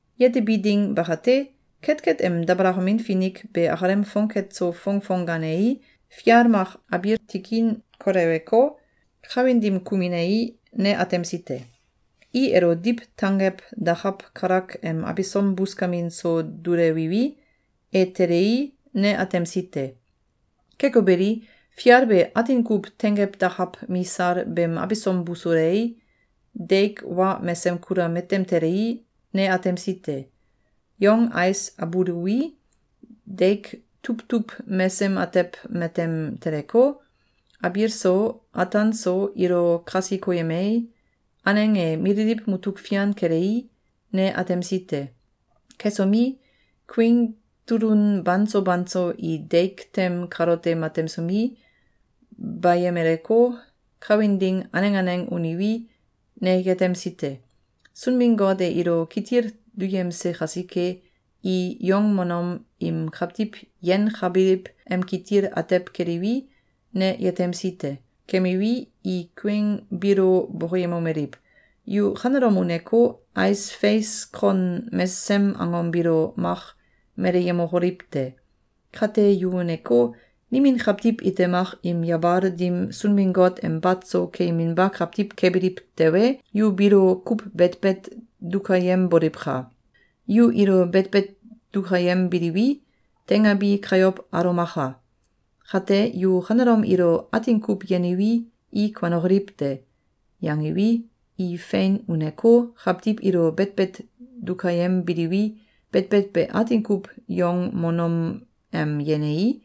Yetebi ding bakate, ketket em dabalakamin finik be akalem fongket so fongfong gaanei, fial mak abiil tikin koleweko, kawin dim kuminei, ne atemsi te. I elo diw tanggew dakaw kalak em abisom buskamin so dulewiwi, e telei, ne atemsi te. Keko beli, fial be atin kuw tenggew dakaw misal beem abisom busulei, deik wa mesem kula matem telei, ne atemsi te. Yong ais abuluwi, deik tuwtuw mesem atew matem teleko, abiil so, ataan so ilo kasi koyemei, aneng e mililiw mutuk fian kelei, ne atemsi te. Kesomi, kuieng tulun banso banso i deik tem kalote matemsomi, bayemeleko, kawin ding aneng aneng uniwi, ne yetemsi te. Sunbin-Got e ilo kitil duyemse kasike, i yongmonom im kawtiw yenkabiliw em kitil atew keliwi, ne yetemsi te. Kemiwi, i kuieng biilo bokoyemomeliw: “Yu kanelom uneko, ais feis kon mesesem angom biilo mak meleyemokoliw te! Kate, yu uneko, nimin kawtiw ite mak im yabal dim Sunbin-Got em bat so keyeminba kawtiw kebiliw tewe, yu biilo kuw betbet dukayemboliwka! Yu ilo betbet dukayembiliwi, teingabi kayow alomaka! Kate, yu kanelom ilo atin kuw yeniwi, i kuanokoliw te!”, yangiwi, i fein uneko, kawtiw ilo betbet dukayembiliwi, betbet be atin kuw yongmonom em yenei,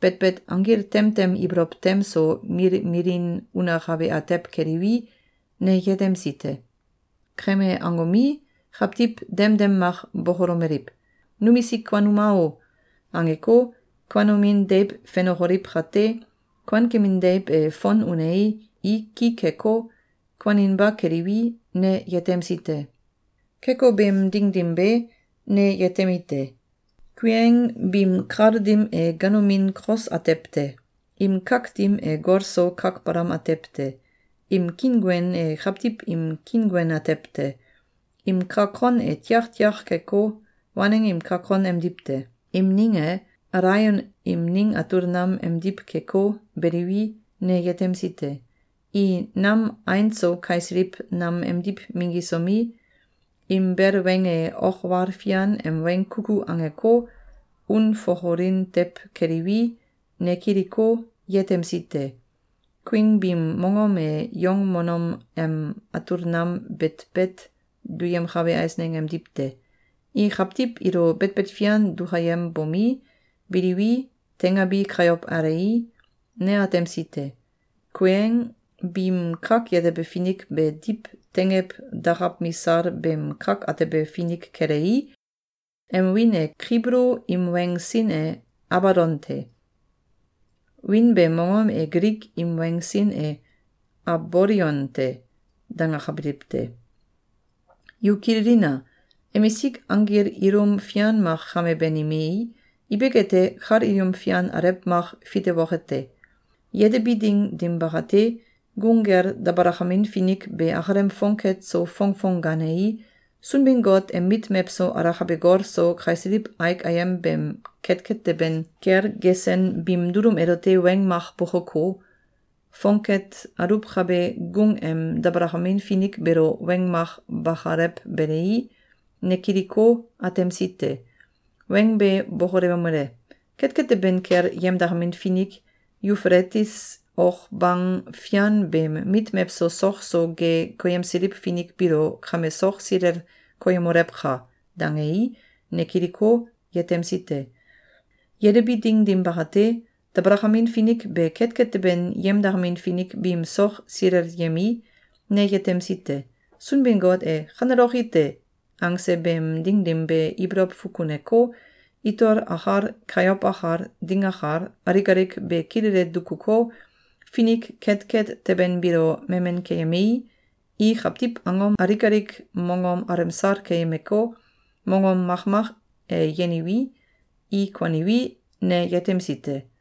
betbet anggil tem tem ibolow tem so milmilin unakabe atew keliwi, ne yetemsi te. Keme angomi, kawtiw demdem mak bokolomeliw: “Numisik kuanuma o!”, angeko, kuanomin deiw fenokoliw kate, kuankemin deiw e fon unei, i ki keko, kuaninba keliwi, ne yetemsi te. Keko beem ding dim be, ne yetemite: Kuieng biim kal dim e ganomin kos atew te. Im kak dim e gol so kak balam atew te. Im kiinguen e kawtiw im kiinguen atew te. Im kak kon e tiaktiak keko, waneng im kak kon emdiw te. Im ning e, alaion im ning atul nam emdiw keko, beliwi, ne yetemsi te. I nam ain so kaisiliw nam emdiw minggisomi, im bel weng e ok wal fian em weng kuku angeko, unfokolin tew keliwi, ne kiliko, yetemsi te. Kuieng biim mongom e yongmonom em atul nam betbet duyemkabe eisneng emdiw te. I kawtiw ilo betbet fian dukayembomi, biliwi, teingabi kayow alei, ne atemsi te. Kuieng biim kak yetebe finik be diw tenggew dakaw misal beem kak atebe finik kelei, em wiin e Kibulu im weng sin e “Abadon te.” Wiin beem mongom e Gilik im weng sin e “Abolion te.”, dangakabiliw te. Yu kililina! Emisik anggil ilum fian mak kame banimei, ibik ete, kal ilum fian alew mak fitewoke te. Yetebi ding dim bakate, gung kel dabalakamin finik be akalem fongket so fongfong gaanei, Sunbin-Got em mit mewso alakabe gol so kaisiliw aik ayem beem ketket teben kel gesen biim dulum elote weng mak bokoko, fongket aluwkabe gung em dabalakamin finik beelo weng mak bakalewbelei, ne kiliko, atemsi te. Weng be bokolewomele: “Ketket teben kel yemdakamin finik Yufeletis ok bang fian beem mit mewso sok so ge koyemsiliw finik biilo kame sok silel koyemolewka!”, dangei, ne kiliko, yetemsi te. Yetebi ding dim bakate, dabalakamin finik be ketket teben yemdakamin finik biim sok silelyemei, ne yetemsi te. Sunbin-Got e “Kaneloki te!”, angse beem ding dim be ibolow fukuneko, itol akal, kayow akal, ding akal, alik alik be kilele dukuko, finik ketket teben biilo memen keyemei, i kawtiw angom alik alik mongom alemsal keyemeko, mongom makmak e yeniwi, i kuaniwi, ne yetemsi te.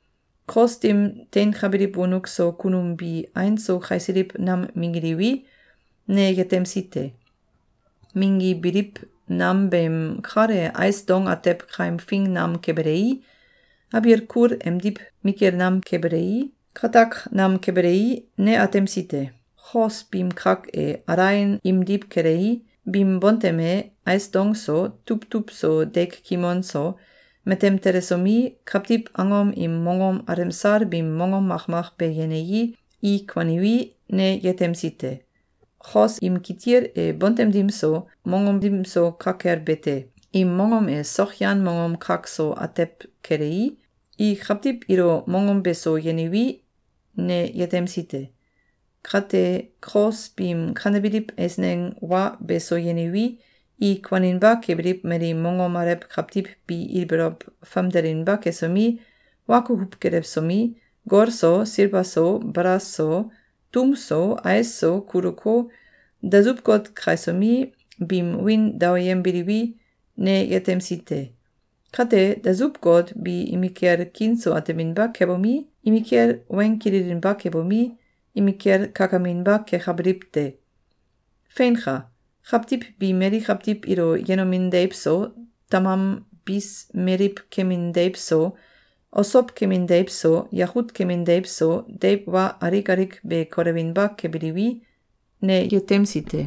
Kos dim teinkabiliw wonuk so kunum bi ain so kaisiliw nam minggiliwi, ne yetemsi te. Minggibiliw nam beem kal e ais dong atew kaimfing nam kebelei, abiil kul emdiw mikil nam kebelei, katak nam kebelei, ne atemsi te. Kos biim kak e, alaion imdiw kelei, biim bontem e, ais dong so, tuwtuw so deik kimon so, matem telesomi, kawtiw angom im mongom alemsal biim mongom makmak be yenei, i kuaniwi, ne yetemsi te. Kos im kitil e bontem dim so, mongom dim so ka kel be te. Im mongom e sokyan mongom kak so atew kelei, i kawtiw ilo mongom beso yeniwi, ne yetemsi te. Kate, kos biim kanebiliw eisneng wa beso yeniwi, i kuaninba kebiliw mali mongom alew kawtiw bi ibolow famdelinba kesomi, wa kukuw gelewsomi, gol so, silba so, balas so, tum so, ais so, kuluko, dasuw god kaisomi, biim wiin daoyembiliwi, ne yetemsi te. Kate, dasuw god bi imikel kiin so ateminba kebomi, imikel weng kililinba kebomi, imikel kakaminba kekabiliw te. Feinka! Kawtiw bi mali kawtiw ilo yenomin deiw so, tamam bis meliw kemin deiw so, osow kemin deiw so, yakut kemin deiw so, deiw wa alik alik be kolewinba kebiliwi, ne yetemsi te.